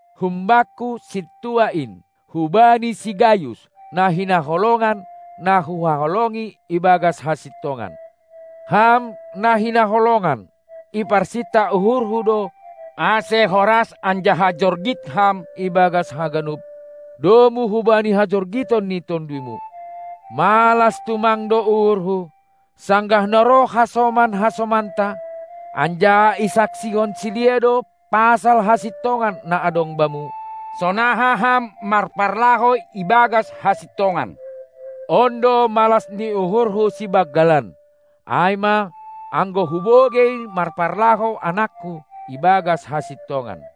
Humbakku, sintua in, hubani si Gayus, na hinaholongan, na huhaholongi ibagas hasintongan. Ham na hinaholongan, iparsinta uhurhu do, ase horas anjaha jorgit ham ibagas haganup, domu hubani hajorgiton ni tonduymu. Malas tumang do uhurhu, sanggah na roh hasoman-hasomanta, anjaha isaksihon sidea do pasal hasintongan na adong bamu, sonaha ham marparlahou ibagas hasintongan. On do malas ni uhurhu sibanggalan, ai ma, anggo hubogei marparlahou anakku ibagas hasintongan.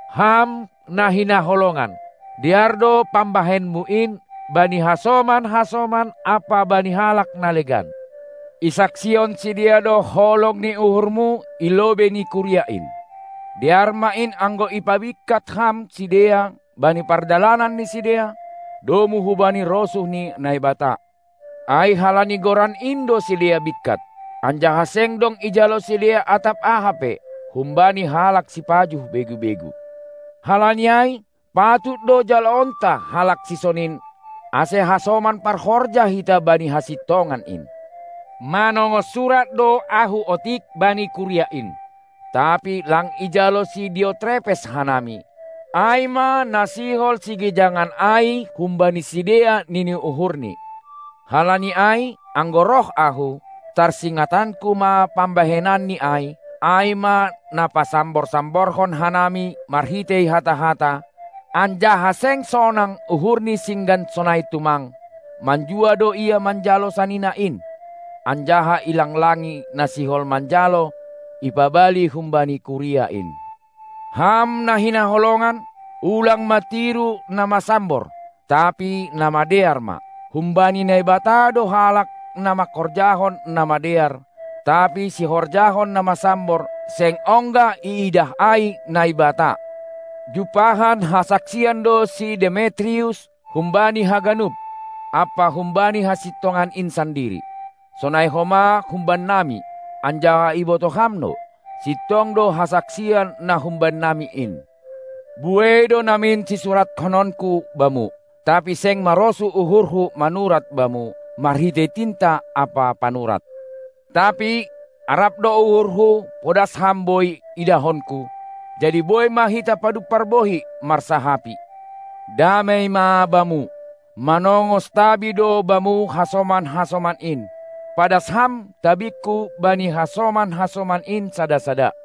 Ham na hinaholongan, dear do pambahenmu in bani hasoman-hasoman ampa bani halak na legan. Isaksihon sidea do holong ni uhurmu i lobei ni kuria in. Dear ma in anggo ipabingkat ham sidea bani pardalanan ni sidea, domu hubani rosuh ni Naibata. Ai halani Goran in do sidea bingkat, anjaha seng dong ijalo sidea atap aha pe humbani halak sipajuh begu-begu. Halani ai, patut do jaloonta halak sisonin, ase hasoman parhorja hita bani hasintongan in. Manongos surat do ahu otik bani kuria in, tapi lang ijalo si Diotrepes hanami, ai ma na sihol sigijangan ai humbani sidea nini uhurni. Halani ai, anggo roh ahu, tarsingatanku ma pambahenanni ai, ai ma na pasambor-samborhon hanami marhitei hata-hata, anjaha seng sonang uhurni singgan sonai tumang, manjua do ia manjalo sanina in, anjaha ilang-langi na sihol manjalo, ipabali humbani kuria in. Ham na hinaholongan, ulang ma tiru na masambor, tapi na madear ma. Humbani Naibata do halak na manghorjahon na madear, tapi sihorjahon na masambor seng ongga iidah ai Naibata. Jumpahan hasaksian do si Demetrius humbani haganup, ampa humbani hasintongan in sandiri; sonai homa humbannami, anjaha ibotoh ham do, sintong do hasaksian na humbannami in. Buei do namin sisurathononku bamu, tapi seng marosuh uhurhu manurat bamu marhitei tinta ampa panurat. Tapi arap do uhurhu podas ham boi idahonku, jadi boi ma hita padumpar bohi marsahapi. Damei ma bamu. Manongos tabi do bamu hasoman-hasoman in. Padas ham tabingku bani hasoman-hasoman in sada-sada!